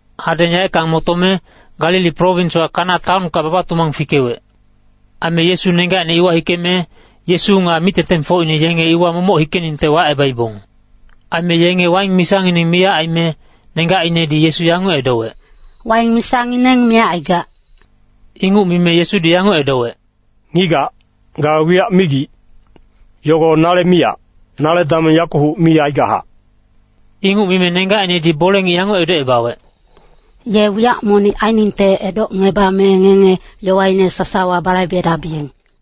Hadeng yaeckang motome, Galili prowinswa Kana taonka baba-tumang fikewec. Aime Yesu nenggacine iwa hikeme, Yesu nga mic-tengtengfocine yenge iwa momoc hikeningte wacebaibong. Aime yenge waing misangineng miyac aime, nenggacinedi Yesu yanguc edowec, “Waing misangineng miyac aigac.” Inguc mime Yesudi yanguc edowec, “Ngigac, ga wiyac migic, yogo nale miyac, nale dameng yakuhuc mi aigachac.” Inguc mime nenggacinedi bole-ngic yanguc edocebawec, “Ye wiyac monic ainingte edocngebame ngenge yowaine sasawa balaibedabiyeng.”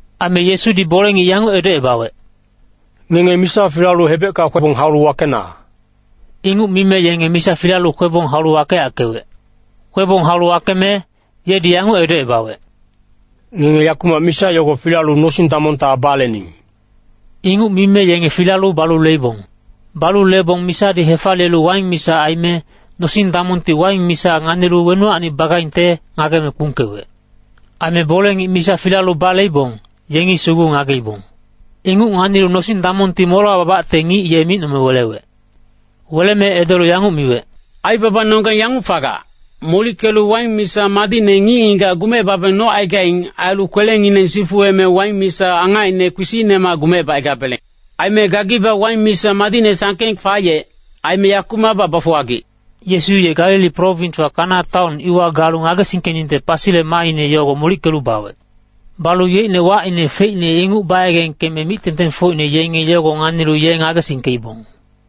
Aime Yesudi bole-ngic yanguc edocebawec, “Ngenge misa filalu hebecka kwebong haulu wakeyackena.” Inguc mime yenge misa filalu kwebong haulu wakeyackewec. Kwebong haulu wakeme, yedi yanguc edocebawec, “Ngenge yakumac misa yogo filalu nosing-damongta balening.” Inguc mime yenge filalu balu leibong. Balu lebong misadi hefaliyelu waing misa aime, nosing-damongti waing misa nganilu wenuwacni bagaingte ngageme kpungkewec. Aime bole-ngic misa filalu baleibong, yengi sugu ngageibong. Inguc nganilu nosing-damongti molewa babacte ngic ye micnome welewec. Weleme edolu yanguc miwec, “Aibabanonggeng yanguc fagac, molickelu waing misa madicne ngic-ngigac gumecebabeng nocaigaing. Ailu kwelengineng sifuweme waing misa angacine kpisicnemac gumecebacaigabeleng. Aime gagibac waing misa madicne sangkeng fayec. Aime yakumacbac bafuwagic.” Yesu ye Galili prowinswa Kana taon iwa galu ngagesingkeningte pasile maaine yogo molickelu bawec. Balu yeicne wacine feicne inguc bayegengkeme mic-tengtengfocine yenge yogo nganilu ye ngagesingkeibong.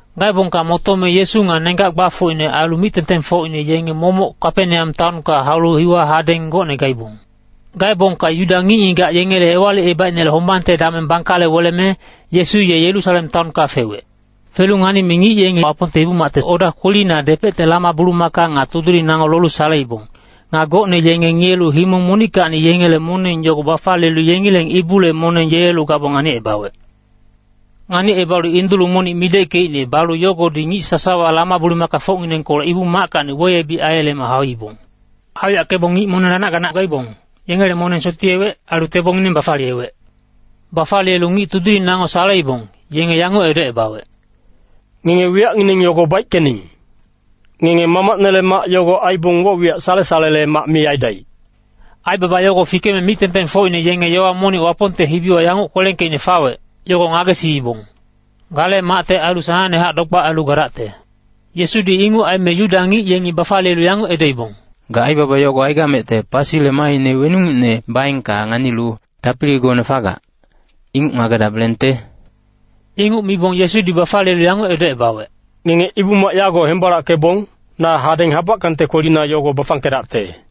Gaebongka motome Yesu nga nenggac gbafocine ailu mic-tengtengfocine yenge momoc Kapeneam taonka haulu iwa hadeng gocne gaibong. Gaebongka Yuda ngic-ngigac yengele Ewalicebaicnele hombangte dameng bangkale weleme, Yesu ye Yerusalem taonka fewec. Felu nganime ngic yenge Wapongte Ibu-macte oda kwelina depecte lama-bulumaka nga tudiling nango lolu saleibong. Nga gocne yenge ngiyelu himong monickacni yengele moneng yogo bafaliyelu yengileng ibule moneng yelelu gabong nganicebawec. Nganicebalu indulu monic mideckeicne balu yogodi ngic sasawa lama-bulumakafocnginengkolec Ibu-mackacni weyebic aiyeleme hauibong. Hauyackebong ngic moneng lanac-ganac gaibong, yengele moneng sotiyewec, ailu tebongineng bafaliyewec. Bafaliyelu ngic tudiling nango saleibong, yenge yanguc edocebawec, “Ngenge wiyacngineng yogo baickening! Ngenge Mamacnele mac yago aibong woc-wiyac sale-salele mac mi aidaic.” Aibaba yogo fikeme mic-tengtengfocine yenge yowa monic Wapongte hibiwa yanguc kwelengkeicne fawec, yogo ngagesiibong, “Gale macte ailu sanangnehac dogbac ailu gadacte.” Yesudi inguc aime Yuda ngic yengi bafaliyelu yanguc edoibong, “Ga aibaba yogo aigamecte, pasile maaine weningucne baengka nganilu tapiligone fagac, inguc ngagedabelengte?” Inguc mibong Yesudi bafaliyelu yanguc edocebawec, “Ngenge ibu-mac yago hembalackebong, na hadeng habackangte kwelina yogo bafangkedacte.”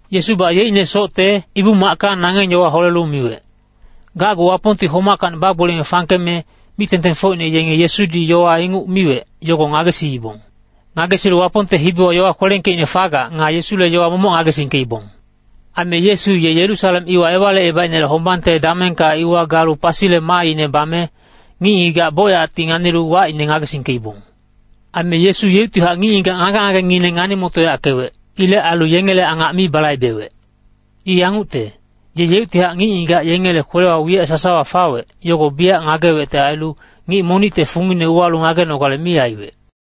Yesubac yeicne socte ibu-macka nangeng yowa holelu miwec. Gacgu Wapongti homackacni bagboliyeme fangkeme, mic-tengtengfocine yenge Yesudi yowa inguc miwec, yogo ngagesiibong. Ngagesilu Wapongte hibiwa yowa kwelengkeicne fagac nga Yesule yowa momoc ngagesingkeibong. Aime Yesu ye Yerusalem iwa Ewalicebaicnele hombangte damengka iwa galu pasile maaine bame, ngic-ngigac bocyacti nganilu wacine ngagesingkeibong. Aime Yesu yeuctihac ngic-ngigac ngage-ngagengineng ngani-motoyackewec. Ilec ailu yengele angac mi balaibewec. I yangucte, ye yeuctihac ngic-ngigac yengele kwelewa wiyac sasawa fawec, yogo biyac ngagewecte ailu, ngic monicte fungine uwalu ngagenogale mi aiwec.